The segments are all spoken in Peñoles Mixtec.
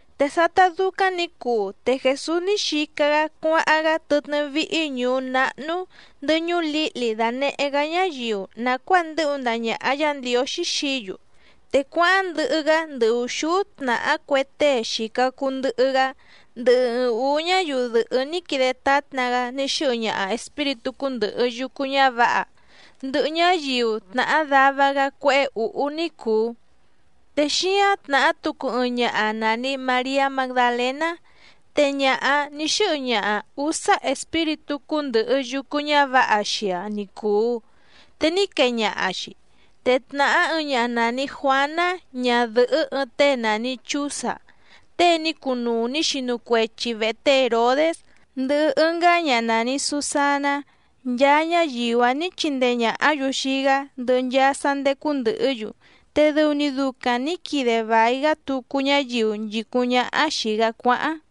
Te sátá dúcáⁿ nǐ cuu te Jèsús ní xica‑gá cuáháⁿ‑gá tɨtnɨ́ víhí ñùú náhnú, ndɨhɨ ñuú lǐhli dànehé‑gá ñáyiu nàcuáa ndɨ́hu ndaha ñàha Yá Ndiǒxí xií‑yu. Te cuáháⁿ ndɨhɨ‑gá ndɨ ùxúú tnàhá cue tée xìca cuu ndɨhɨ‑gá, ndɨhɨ ɨɨⁿ ǔú ñáyiu dɨ̀hɨ́ ní quide tátna‑gá ní xɨ́hɨ ñaha espíritú cúndɨ̀hɨ yucu ñávǎha, ndɨhɨ ñáyiu tnàhá dava‑gá cuéhé ǔhú ní cùu. Te xíáⁿ tnàhá tucu ɨɨⁿ ñaha nàni Mariá Magdalèná, te ñaha‑áⁿ nǐ xɨ́hɨ ñaha ǔsá espíritú cúndɨ̀hɨ yucu ñávǎha xii‑aⁿ ni cùu, te ní quee ñaha‑xi. Te tnàhá ɨɨⁿ ñaha nàni Juáná ñadɨ̀hɨ́ ɨɨⁿ tée nàni Chúza tée ní cunuu nǐ xinu cuechi vèhe té Hèrodés, ndɨhɨ ɨngá ñaha nàni Susaná nchaa ñáyiu‑áⁿ nǐ chindee ñàhá‑yu xii‑gá ndɨhɨ nchaa sá ndécú ndɨ̀hɨ́‑yu, te dɨu‑ni ducaⁿ nǐ quide vài‑gá tucu ñáyiu nchìcúⁿ ñáhá xìi‑gá cuáháⁿ.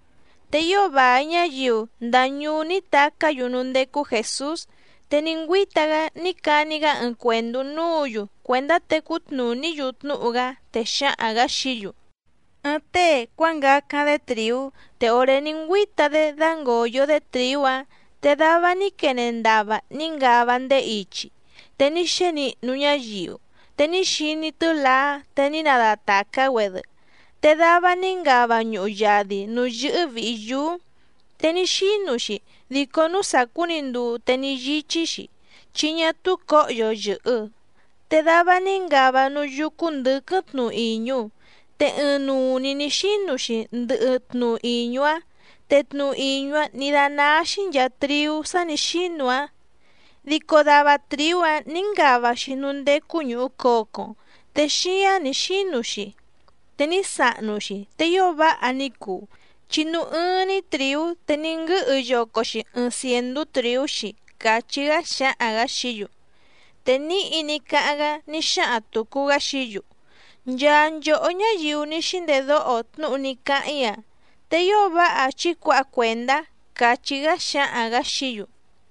Te ío vài ñáyiu ndaa ñuú ní tacá‑yu núú ndécú Jèsús, te ní ngüíta‑gá ní cani‑gá ɨɨⁿ cuèndú núǔ‑yu cuèndá tecú tnùní‑yu tnúhu‑gá, te xáhaⁿ‑gǎ xií‑yu: —Ɨɨⁿ tée cuángacáⁿ‑dé trìú. Te òré ní ngüíta‑dé dǎngoyo‑dé trìú‑áⁿ te dava ní quene ndava ní ngava ndéé ichi, te ní xénihnu ñáyiu, te ní xiní tɨ́laá te ní nadatàcá‑güedɨ. Te dava ní ngava ñuhu yadi nǔú yɨ́hɨ́ vìhi yúú, te ní xínu‑xi dico núú sàcú‑ni nduu te ní yíchí‑xi, chi ñá túú cǒhyo yɨ̀hɨ. Te dava ní ngava núú yúcú ndɨ̌quɨ́ⁿ tnu ìñu, te ɨɨⁿnuu‑ni nǐ xínu‑xi ndɨhɨ tnu ìñu‑áⁿ, te tnu ìñu‑áⁿ nǐ dánáá‑xí nchàa triú sá nǐ xínu‑áⁿ. Dico dava trìú‑áⁿ nǐ ngava‑xi núú ndécú ñùhu cocoⁿ, te xíǎⁿ ní xínu‑xi te ní sahnu‑xi, te ío váha ní cuu, chi núú ɨ́ɨ́ⁿ‑ní trìú te ní nguɨ́hɨ yoco‑xi ɨɨⁿ cièndú trìú‑xi —càchí‑gá xáhaⁿ‑gǎ xií‑yu. Te níhi ní cáháⁿ‑gá ní xáhaⁿ tùcu‑gá xií‑yu: —Nchaa nchòhó ñáyiu ní xíndedóho tnúhu ní cáháⁿ‑í‑a, te ío váha chí cuǎha cuèndá —càchí‑gá xáhaⁿ‑gǎ xií‑yu.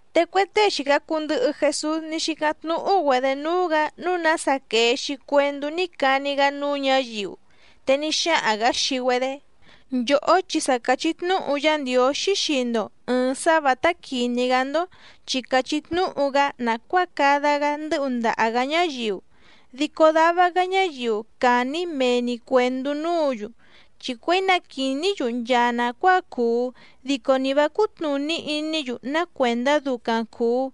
Te cue tée xìca cuu ndɨhɨ Jesús ní xícáⁿ tnúhú‑güedě núú‑gǎ nǔu nása quèe‑xi cuendú ní cani‑gá núú ñǎyiu. Te ní xáhaⁿ‑gǎ xii‑güedé: —Nchòhó chi sa càchí tnúhu Yá Ndiǒxí xii‑ndo ɨ̀ɨⁿ sá vǎtá quìní‑gá‑ndó, chi càchí tnúhu‑gá nàcuáa cada‑gá ndɨ́hu ndaha‑gǎ ñáyiu, dico dava‑gá ñáyiu càni‑í mee‑ni cuèndú núǔ‑yu, chi cuěi na quìní‑yu nchaa nàcuáa cuu dico nì vá cútnùní iní‑yu ná cuèndá ducaⁿ cùu,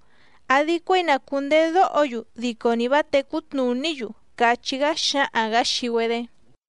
àdi cuéi na cùndedóho‑yu dico nì vá tècú tnùní‑yu —càchí‑gá xáhaⁿ‑gǎ xii‑güedé.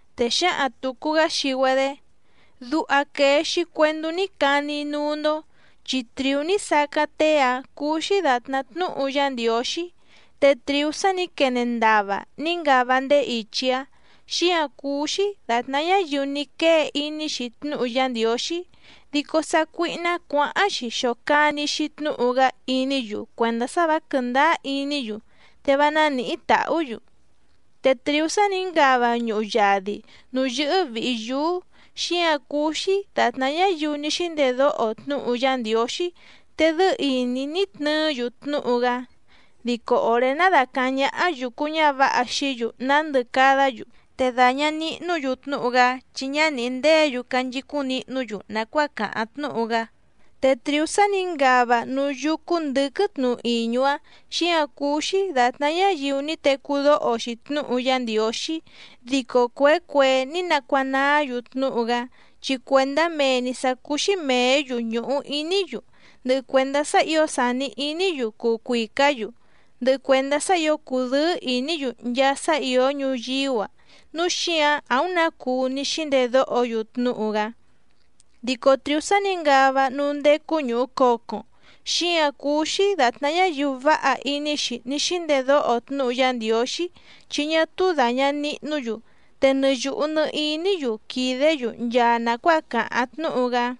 Te xǎhaⁿ tùcu‑gá xii‑güedé: —Duha quèe‑xi cuendú ní cani‑í núú‑ndó, chi trìú ní sacáⁿ tée‑áⁿ cúú‑xí dàtná tnúhu Yá Ndiǒxí. Te trìú sá nǐ quene ndava ní ngava ndéé ichi‑áⁿ, xíǎⁿ cúú‑xí dàtná ñáyiu ní quée iní‑xi tnúhu Yá Ndiǒxí, dico sácuíhná cuǎháⁿ‑xi xòcani‑xi tnúhu‑gá iní‑yu cuèndá sá vǎ quɨ̀ndáá iní‑yu, te vá nánìhí tàhú‑yu. Te trìú sá nǐ ngava ñuhu yadi nǔú yɨ́hɨ́ vìhi yúú, xíǎⁿ cúú‑xí dàtná ñáyiu ní xíndedóho tnúhu Yá Ndiǒxí te dɨ́ɨ́ ìní ní tnɨɨ́‑yu tnúhu‑gá, dico òré ná dàcaháⁿ ñáhá yùcu ñávǎha xií‑yu nándɨ cadá‑yu, te dàña nihnú‑yu tnúhu‑gá chi ñá nìhí ndéě‑yu canchicúⁿ nihnú‑yu nàcuáa càháⁿ tnúhu‑gá. Te trìú sá nǐ ngava núú yúcú ndɨ̌quɨ́ⁿ tnu ìñu‑áⁿ, xíǎⁿ cúú‑xí dàtná ñáyiu ní tecú dóho‑xi tnúhu Yá Ndiǒxí, dico cuèé cuèé ní nacuanaá‑yu tnúhu‑gá, chi cuèndá mee‑ni sǎ cúú‑xí mèé‑yu ñùhu iní‑yu, ndɨhɨ cuèndá sá ǐo sàni iní‑yu cuu cuìcá‑yu, ndɨhɨ cuèndá sá ǐo cùdɨ́ɨ́ ìní‑yu nchaa sá ìó ñuyíú‑a núu xíǎⁿ àúⁿ nǎ cuu ní xíndedóho‑yu tnúhu‑gá. Dico trìú sá nǐ ngava núú ndécú ñùhu cocoⁿ, xíǎⁿ cúú‑xí dàtná ñáyiu váha iní‑xi ní xíndedóho tnúhu Yá Ndiǒxí chi ñá túú dàña nihnú‑yu, te nɨ yùhu nɨ iní‑yu quìdé‑yu nchaa nàcuáa càháⁿ tnúhu‑gá.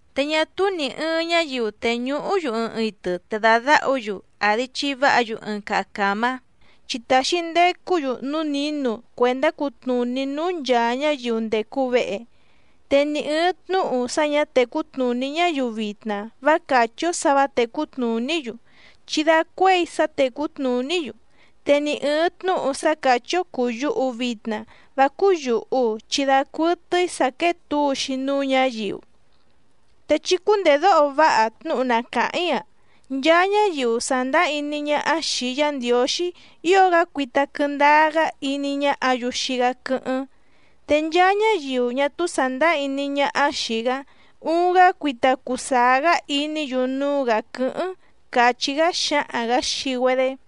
’Te ñá túú nì ɨɨⁿ ñáyiu tèñuhú‑yu ɨɨⁿ itɨ te dàdáhu‑yu, àdi chiváha‑yu ɨɨⁿ caha càmá, chi tàxi ndecú‑yu núú nǐnu cuèndá cutnùní núú nchàa ñáyiu ndècu vehe. Te ni ɨ̀ɨⁿ tnúhu sá ñǎ tècú tnùní ñáyiu vitna vá càchí‑ó sǎ vǎ tècú tnùní‑yu chi dacuéi sá tècú tnùní‑yu, te ni ɨ̀ɨⁿ tnúhu sá càchí‑ó cùu yuhu vitna vá cúú yùhu chi dacuɨtɨ́í sǎ quéé tǔu‑xi núú ñǎyiu. ’Te chí cúndèdóho váha tnúhu na càháⁿ‑í‑a. Nchaa ñáyiu sàndáá iní ñáhá xìi Yá Ndiǒxí ío‑gá cuita quɨndáá‑gá iní ñáhǎ‑yu xii‑gá quɨ́hɨ́ⁿ, te nchaa ñáyiu ñá túú sàndáá iní ñáhá xìi‑gá uuⁿ‑gá cuita cuu sàá‑gá iní‑yu núú‑gǎ quɨ́hɨ́ⁿ —càchí‑gá xáhaⁿ‑gǎ xii‑güedé.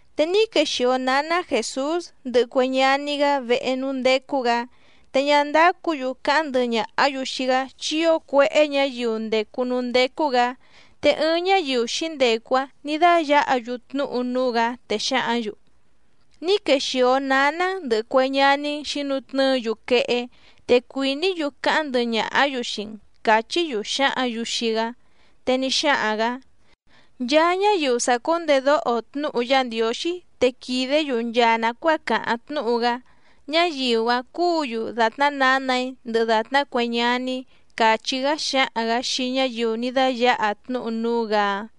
Te ní quexìo náná Jèsús ndɨhɨ cue ñaní‑gá vehe núú ndécú‑gǎ, te ñá ndácǔ‑yu cáháⁿ ndɨhɨ ñàhá‑yu xii‑gá chi ío cuéhé ñǎyiu ndècu núú ndécú‑gǎ. Te ɨɨⁿ ñáyiu xǐndecu‑áⁿ nǐ dáyǎha‑yu tnúhu núú‑gǎ, te xǎhǎⁿ‑yu: —Ní quexìo náná‑n ndɨ̀hɨ cue ñaní‑n xǐnutnɨ́ɨ‑yu quehé, te cuìní‑yu cáháⁿ ndɨhɨ ñàhá‑yu xii‑n —càchí‑yu xǎhǎⁿ‑yu xii‑gá. Te ní xáhaⁿ‑gǎ: —Nchaa ñáyiu sàcúndedóho tnúhu Yá Ndiǒxí te quìdé‑yu nchaa nàcuáa càháⁿ tnúhu‑gá, ñáyiu‑áⁿ cúǔ‑yu dàtná nǎnà‑í ndɨhɨ dàtná cue ñaní‑í —càchí‑gá xáhaⁿ‑gǎ xii ñáyiu ní dáyǎha tnúhu núú‑gǎ‑áⁿ.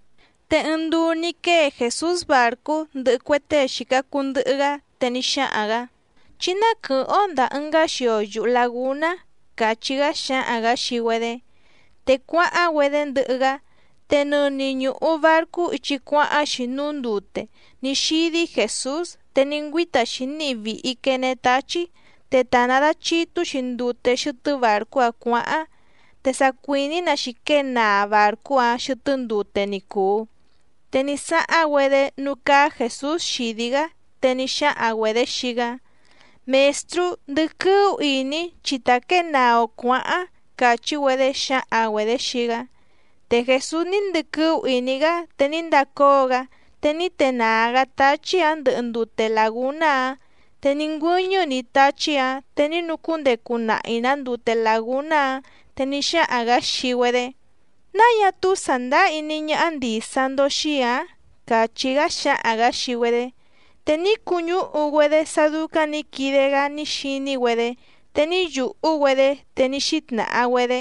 Te ɨɨⁿ nduu ní quée Jèsús bàrcú ndɨhɨ cue tée xìca cuu ndɨhɨ‑gá, te ní xáhaⁿ‑gǎ: —Chí ná quɨ̀hɨ́ⁿ‑ó ndàa ɨngá xio yuhu làgúná —càchí‑gá xáhaⁿ‑gǎ xii‑güedé. Te cuáháⁿ‑güedé ndɨhɨ‑gá. Te nɨni ñùhu barcú ichi cuáháⁿ‑xi núú ndute ní xídí Jèsús. Te ní ngüíta‑xi níhi vìhi quene táchí te ta nàdachitú‑xi ndute xɨtɨ́ bàrcú‑áⁿ cuǎháⁿ, te sa cuìní‑nǎ‑xi quée naa bàrcú‑áⁿ xɨtɨ́ ndute ni cùu. Te ní sáháⁿ‑güedé núú cáá Jèsús xìdí‑gá, te ní xáhaⁿ‑güedě xii‑gá: —¡Mèstrú, ndɨquɨ́ú ìní chi tà quée naa‑o cuǎháⁿ! —càchí‑güedé xǎhaⁿ‑güedě xii‑gá. Te Jèsús ní ndɨquɨ́ú ìní‑gá te ní ndacóo‑gá te ní tenàá‑gá táchí‑ǎⁿ ndɨhɨ ndute làgúná‑áⁿ, te ní ngüɨ́ñɨ́‑ni táchí‑ǎⁿ te ní nucúndecu nahi‑nǎ ndute làgúná‑áⁿ. Te ní xáhaⁿ‑gǎ xii‑güedé: —¿Náa ñá túú sàndáá iní ñáhá ndìsa‑ndo xii‑í ǎⁿ? —càchí‑gá xáhaⁿ‑gǎ xii‑güedé. Te ní cuñúhu‑güedé sá dúcáⁿ nǐ quide‑gá ní xiní‑güedé, te ní yùhú‑güedé, te ní xítnàha‑güedé: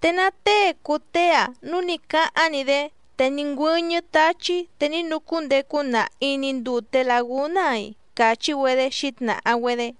—¿Te ná tée cùu tée‑a núu ní cáháⁿ‑ni‑dé te ní ngüɨ́ñɨ́ táchí te ní nucúndecu nahi‑ni ndùte lagúná‑a‑i? —càchí‑güedé xǐtnàha‑güedé.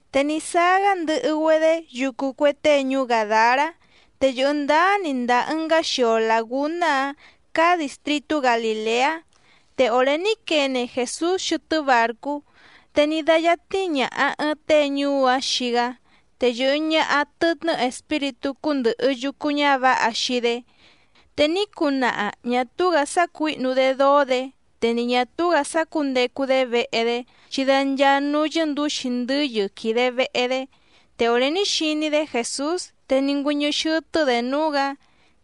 Te ní sáá‑gá ndɨhɨ‑güedé yucu cue tée ñuú Gàdará, te yɨ̀hɨ ndáá‑ni ndàa ɨngá xio làgúná‑áⁿ cáá dìstritú Galìleá. Te òré ní quene Jèsús xɨtɨ́ bàrcú te ní dáyátní ñàha ɨɨⁿ tée ñuú‑áⁿ xii‑gá, te yɨ̀hɨ ñaha tɨtnɨ́ espíritú cúndɨ̀hɨ yucu ñávǎha xii‑dé. Te ní cunaha ñà túú‑gǎ sácuǐhnu‑dé dóó‑dě, te ni ñà túú‑gǎ sácǔndecu‑dé vehe‑dé, chi da nchaa núú yɨ́ndǔxi ndɨ́yɨ quìde vehe‑dé. Te òré ní xiní‑dé Jèsús te ní ngüɨ́ñɨ́ xɨ́tɨ́‑dě núú‑gǎ,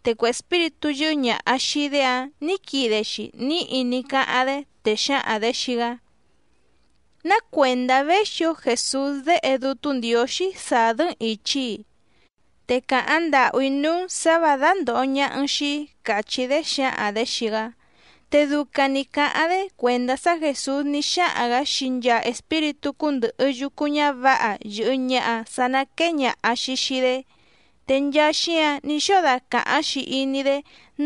te cue espíritú yɨ́hɨ́ ñàha xii‑dé‑áⁿ nǐ quide‑xi níhi ní cáháⁿ‑dé, te xǎhaⁿ‑dě xii‑gá: —¿Ná cuèndá véxi‑ǒ Jèsús Déhe Dútú Ndiǒxí sàdɨ́‑n ìchi‑í‑i? Te càháⁿ ndàhú‑í núú‑n sǎ và dándòho ñaha‑n xii‑í —càchí‑dé xǎhaⁿ‑dě xii‑gá. Te ducaⁿ nǐ cáháⁿ‑dé cuèndá sá Jèsús ní xáhaⁿ‑gǎ xii nchaa espíritú cúndɨ̀hɨ yucu ñávǎha yɨ̀hɨ ñaha sá ná quèe ñaha‑xi xii‑dé. Te nchaa xíǎⁿ ní xóo dacàháⁿ‑xi iní‑dé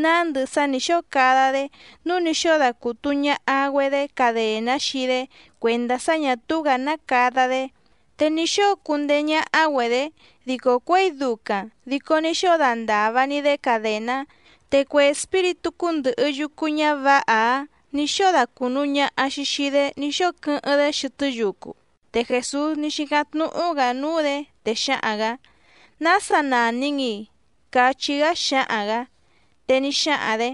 nándɨ sá nǐ xóo cada‑dé nǔu ní xóo dacùtu ñaha‑güedé cadèná xii‑dé cuèndá sá ñà túú‑gǎ ná cada‑dé, te ní xóo cundeé ñáhá‑güedě, dico cuěi ducaⁿ dico ní xóo dandàva‑ni‑dé cadèná, te cue espíritú cúndɨ̀hɨ yucu ñávǎha‑áⁿ nǐ xóo dacùnu ñaha‑xi xii‑dé ní xóo quɨ́hɨ́ⁿ‑dé xɨtɨ́ yucu. Te Jèsús ní xícáⁿ tnúhú‑gǎ núú‑dě, te xáhaⁿ‑gǎ: —¿Nása nàni‑n‑i? —cachí‑gá xáhaⁿ‑gǎ. Te ní xáhaⁿ‑dě: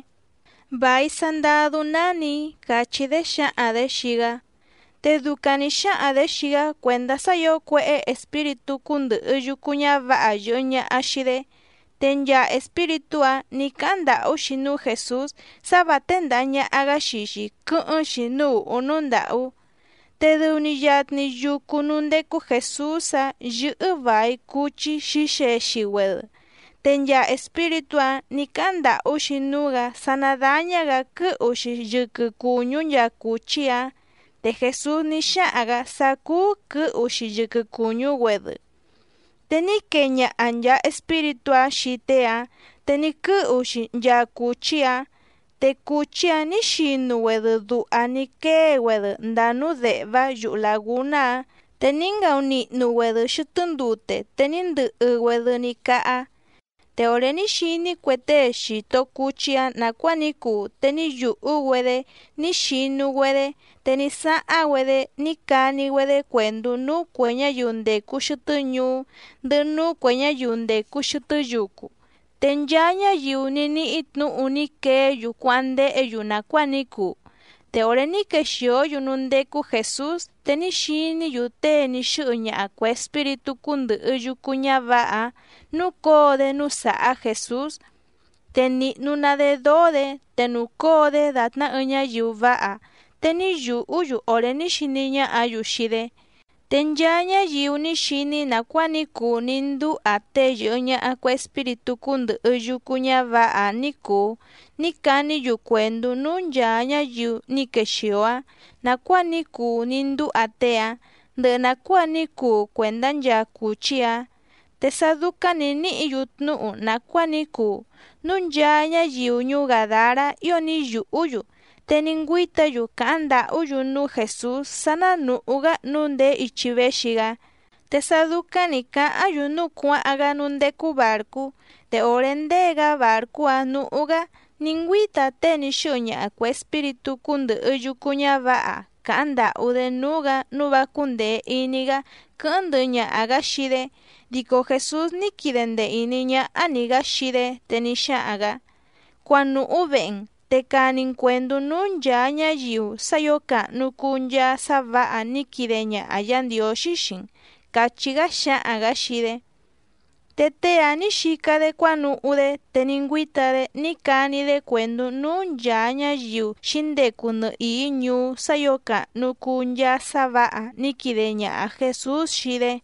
—Vài Sandadú nánì‑í —càchí‑dé xǎhaⁿ‑dě xii‑gá. Te ducaⁿ nǐ xáhaⁿ‑dě xii‑gá cuèndá sá ǐo cuéhé espíritú cúndɨ̀hɨ yucu ñávǎha yɨ̀hɨ ñaha xii‑dé. Te nchaa espíritú‑áⁿ nǐ cáháⁿ ndàhú‑xi núú Jèsús sá vǎ téndàha ñaha‑gá xii‑xi quɨ́hɨ́ⁿ‑xi núú ùhú núú ndàhú. Te dɨu‑ni yatni yucu núú ndécú Jèsús‑áⁿ yɨ́hɨ́ vài cuchí xǐxexi‑güedɨ, te nchaa espíritú‑áⁿ nǐ cáháⁿ ndàhú‑xi núú‑gǎ sá ná dàña‑gá quɨ́hu‑xi yɨquɨ cùñú nchaa cùchí‑áⁿ, te Jèsús ní xáhaⁿ‑gǎ sá cúú quɨ̌hu‑xi yɨquɨ cùñú‑güedɨ. Te ní quee ñaha nchàa espíritú‑áⁿ xii tée‑áⁿ, te ní quɨ́hu‑xi nchaa cùchí‑áⁿ, te cùchí‑áⁿ nǐ xinu‑güedɨ duha ní quée‑güedɨ ndàa núú dèhvá yuhu làgúná‑áⁿ, te ní ngaunihnu‑güedɨ xɨtɨ́ ndute te ní ndɨhɨ‑güedɨ ní cáhá. Te òré ní xiní cue tée xìto cuchí‑áⁿ nàcuáa ní cuu te ní yùhú‑güedé ní xinu‑güedé, te ní sáháⁿ‑güedé ní cani‑güedé cuèndú núú cuè ñáyiu ndècu xɨtɨ́ ñuú, ndɨhɨ núú cuè ñáyiu ndècu xɨtɨ́ yucu. Te nchaa ñáyiu ní níhí tnǔhu ní queé‑yu cuáháⁿ ndéhě‑yu nàcuáa ní cuu. Te òré ní quexìó‑yu núú ndécú Jèsús, te ní xiní‑yu tée ní xɨ́hɨ ñaha cuè espíritú cúndɨ̀hɨ yucu ñávǎha‑áⁿ núcǒo‑dé núú sàhá Jèsús, te nìhnu‑ná‑dé dóó‑dě, te nùcóo‑dé dàtná ɨɨⁿ ñáyiu váha, te ní yùhú‑yu òré ní xiní ñáhǎ‑yu xii‑dé. Te nchaa ñáyiu ní xiní nàcuáa ní cuu ní ndúha tée yɨ̀hɨ ñaha cue espíritú cúndɨ̀hɨ yucu ñávǎha‑áⁿ ní cùu ní caní‑yu cuèndú núú nchàa ñáyiu ní quexìo‑áⁿ nàcuáa ní cuu ní ndúha tée‑áⁿ ndɨhɨ nàcuáa ní cuu cuèndá nchaa cùchí‑áⁿ. Te sá dúcáⁿ nǐ níhǐ‑yu tnúhu nàcuáa ní cuu, núu nchaa ñáyiu ñuú Gàdará ío ní yùhú‑yu te ní ngüíta‑yu càháⁿ ndàhú‑yu núú Jèsús sá ná nùhú‑gá nǔu ndèé ichi véxi‑gá. Te sá dúcáⁿ nǐ cáháⁿ‑yu núu cuáháⁿ‑gá núú ndécú bàrcú. Te òré ndée‑gá bàrcú‑áⁿ nǔhú‑gá ní ngüíta tée ní xɨ́hɨ ñaha cuè espíritú cúndɨ̀hɨ yucu ñávǎha càháⁿ ndàhú‑dé núú‑gǎ nǔu vá cúndèe iní‑gá quɨ́hɨ́ⁿ ndɨhɨ ñaha‑gǎ xii‑dé, dico Jèsús ní quide ndee ìní ñáhá‑ni‑gǎ xii‑dé, te ní xáhaⁿ‑gǎ: —Cuanùhú vehe‑n, te cani‑n cuèndú núú nchàa ñáyiu sá ǐo càhnu cuu nchaa sá vǎha ní quide ñaha Yǎ Ndiǒxí xii‑n —càchí‑gá xáhaⁿ‑gǎ xii‑dé. Te tée‑áⁿ nǐ xica‑dé cuánuhú‑dé te ní ngüíta‑dé ní cani‑dé cuèndú núú nchàa ñáyiu xǐndecu nɨhìí ñuú sá ǐo càhnu cuu nchaa sá vǎha ní quide ñaha Jèsús xii‑dé.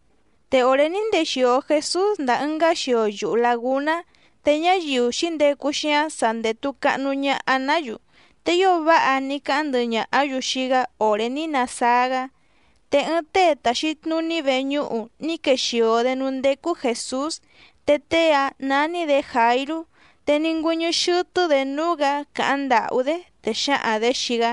Te òré ní ndexìo Jesús ndàa ɨngá xio yuhu làgúná, te ñáyiu xǐndecu xíáⁿ sa ndètu cahnu ñaha‑ná‑yu, te ío váha ní cáháⁿ ndɨhɨ ñàhá‑yu xii‑gá òré ní nasáá‑gá. Te ɨɨⁿ tée tàxi tnuní veñúhu ní quexìo‑dé núú ndécú Jèsús, te tée‑áⁿ nání‑dě Jàirú, te ní ngüɨ́ñɨ́ xɨ́tɨ́‑dě núú‑gǎ càháⁿ ndàhú‑dé, te xǎhaⁿ‑dě xii‑gá: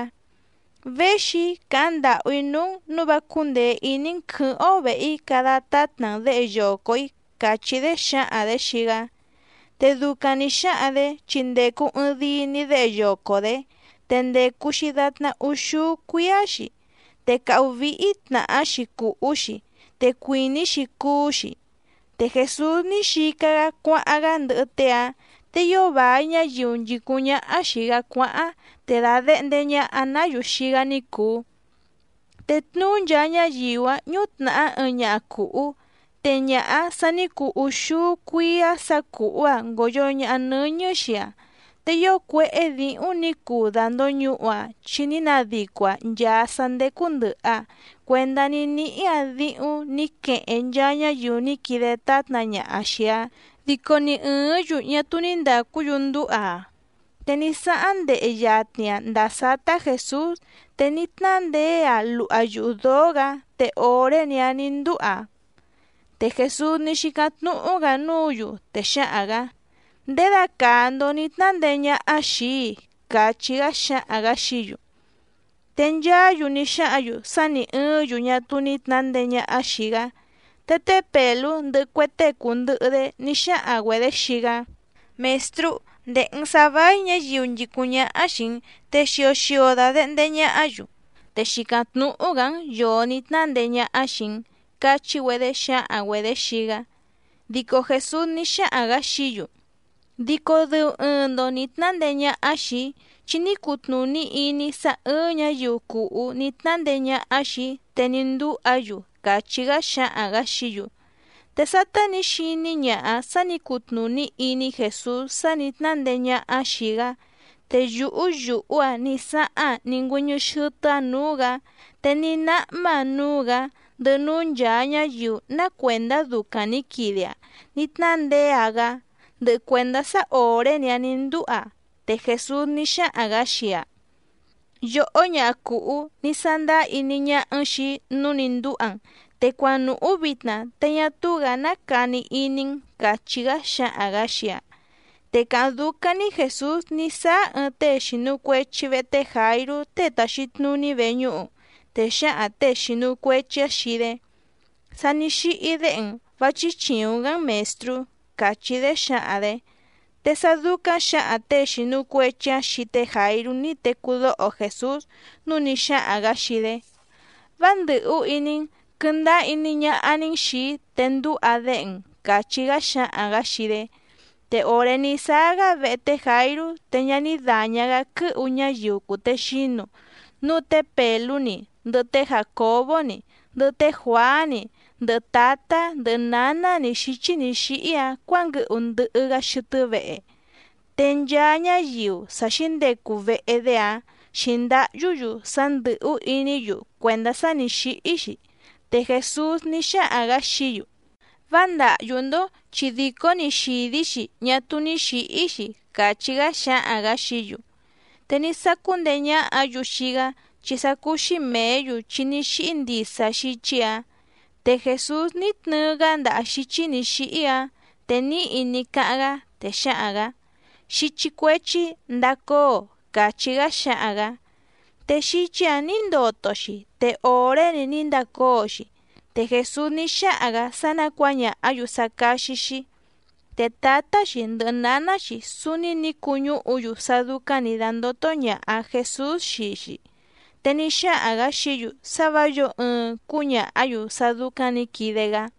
—Véxi‑í càháⁿ ndàhú‑í núú‑n nǔu vá cúndèe iní‑n quɨ̌hɨ́ⁿ‑ó vèhe‑í cada tátna‑n děhe yoco‑ǐ —càchí‑dé xǎhaⁿ‑dě xii‑gá. Te ducaⁿ nǐ xáhaⁿ‑dě chi ndècu ɨɨⁿ dii‑ni déhe yoco‑dě, te ndècu‑xi datná úxúú cuíá‑xi, te càhú víhí tnàhá‑xi cùhú‑xi te cuìní‑xi cuú‑xi. Te Jèsús ní xica‑gá cuáháⁿ‑gá ndɨhɨ tée‑áⁿ, te ío vài ñáyiu nchìcúⁿ ñáhá xìi‑gá cuáháⁿ, te dàdehnde ñaha‑ná‑yu xii‑gá ní cùu. Te tnuú nchaa ñáyiu‑áⁿ ñútnàhá ɨɨⁿ ñaha cùhú, te ñaha‑áⁿ sà ní cuu úxúú cuíá sǎ cùhú‑aⁿ ngòyo ñaha nɨ́ñɨ́ xii‑aⁿ, te ío cuéhé dǐhúⁿ nǐ cuu dàndoñuhu‑aⁿ chi ní nadico‑aⁿ nchàa sá ndécú ndɨ̀hɨ‑aⁿ cuendá ní níhí‑aⁿ díhúⁿ nǐ queheⁿ nchaa ñáyiu ní quide tátna ñaha xìi‑aⁿ, dico ni ɨ̀ɨ́ⁿ‑yu ñá túú ní ndàcú‑yu ndúha‑aⁿ. Te ní sáháⁿ ndehe yatni‑aⁿ ndàa sátá Jèsús, te ní tnándeé‑aⁿ luha yuhu dǒó‑gǎ te òré‑ni‑áⁿ nǐ ndúha‑aⁿ. Te Jèsús ní xícáⁿ tnúhú‑gǎ núǔ‑yu, te xáhaⁿ‑gǎ: —¿Ndědacàa‑ndo ní tnándeé ñáhá xìi‑í? —càchí‑gá xáhaⁿ‑gǎ xií‑yu. Te nchaá‑yu ní xáhǎⁿ‑yu sá nǐ ɨɨ́ⁿ‑yu ñá túú ní tnǎndeé ñáhá xìi‑gá. Te té Pèlú ndɨhɨ cue tée cùndɨhɨ‑dé ní xáhaⁿ‑güedě xii‑gá: —Mèstrú, ndèhe‑n sá váí ñǎyiu nchìcúⁿ ñáhá xìi‑n, te xio xio dàdehnde ñahá‑yu, te xìcáⁿ tnúhú‑gǎ‑n yòo ní tnándeé ñáhá xìi‑n —cachí‑güedé xǎhaⁿ‑güedě xii‑gá. Dico Jèsús ní xáhaⁿ‑gǎ xií‑yu: —Dico dɨu ɨɨⁿ‑ndo nǐ tnándeé ñáhá xìi‑í, chi ní cutnùní iní‑í sá ɨ̀ɨⁿ ñáyiu cùhú ní tnándeé ñáhá xìi‑í te ní ndúha‑yu —càchí‑gá xáhaⁿ‑gǎ xií‑yu. Te sátá nǐ xiní ñaha‑áⁿ sǎ nǐ cutnùní iní Jèsús sá nǐ tnándeé ñáhá‑áⁿ xìi‑gá, te yùhú yùhú‑aⁿ ní sáhá‑aⁿ ní ngüɨ́ñɨ́ xɨ́tɨ́‑áⁿ nǔú‑gǎ, te ní náhmá‑aⁿ núú‑gǎ, ndɨhɨ núú nchàa ñáyiu ná cuèndá ducaⁿ nǐ quide‑aⁿ ní tnándeé‑aⁿ‑gá, ndɨhɨ cuèndá sá òré‑ni‑áⁿ nǐ ndúha‑aⁿ. Te Jèsús ní xáhaⁿ‑gǎ xii‑aⁿ: —Yòhó ñaha cùhú, ní sándáá iní ñáhá‑n xìi‑í nǔu ní ndúha‑n, te cuanùhú vitna te ñá túú‑gǎ ná cani iní‑n —càchí‑gá xáhaⁿ‑gǎ xii‑aⁿ. Te càháⁿ dúcáⁿ‑ní Jèsús ní sáá ɨɨⁿ tée xìnu cuechi vehe té Jàirú tée tàxi tnuní veñúhu, te xǎhaⁿ těe xìnu cuechi‑áⁿ xii‑dé: —Sa ní xíhí déhe‑n, vá chíchìuⁿ‑gá‑n Mèstrú —càchí‑dé xǎhaⁿ‑dě. Te sá dúcáⁿ xǎhaⁿ těe xìnu cuechi‑áⁿ xii té Jàirú ní tecú dóho Jèsús, núu ní xáhaⁿ‑gǎ xii‑dé: —Vá ndɨ̀hú iní‑n, quɨndáá iní ñáhá‑ní‑n xìi‑í te ndúha déhe‑n —càchí‑gá xáhaⁿ‑gǎ xii‑dé. Te òré ní sáá‑gá vehe té Jàirú te ñá ní dàña‑gá quɨ́hu ñáyiu cùtexínu, núu té Pèlú‑ni ndɨhɨ té Jàcobó‑ni, ndɨhɨ té Juàá‑ni, ndɨhɨ tǎtá ndɨhɨ nǎná‑ni xǐchí nǐ xíhí‑áⁿ cuǎnguɨhu ndɨhɨ‑gá xɨtɨ́ vehe. Te nchaa ñáyiu sa xíndecu vehe‑dé‑áⁿ xǐndáhyú‑yu sá ndɨ̀hú iní‑yu cuèndá sá nǐ xíhí‑xi. Te Jèsús ní xáhaⁿ‑gǎ xií‑yu: —Vá ndàhyú‑ndó, chi dìcó‑ni xìdí‑xi ñá túú ní xǐhí‑xi —càchí‑gá xáhaⁿ‑gǎ xií‑yu. Te ní sácú ndeé ñáhǎ‑yu xii‑gá, chi sá cúú‑xí mèé‑yu chi ní xíhí ndisa xíchí‑ǎⁿ. Te Jèsús ní tnɨɨ‑gá ndaha xíchí nǐ xíhí‑áⁿ, te níhi ní cáháⁿ‑gá, te xáhaⁿ‑gǎ: —Xíchí cuéchí, ndacóo —càchí‑gá xáhaⁿ‑gǎ. Te xíchí‑ǎⁿ nǐ ndoto‑xi, te òré‑ni ní ndacóo‑xi, te Jèsús ní xáhaⁿ‑gǎ sá ná cuǎñàhá‑yu sá cáxí‑xí. Te tǎtá‑xi ndɨhɨ nǎná‑xi súúní nǐ cuñúhu‑yu sá dúcáⁿ nǐ dándótó ñàha Jesús xii‑xi, te ní xáhaⁿ‑gǎ xií‑yu sá vǎ yǒo ɨɨⁿ cúñàhá‑yu sá dúcáⁿ nǐ quide‑gá.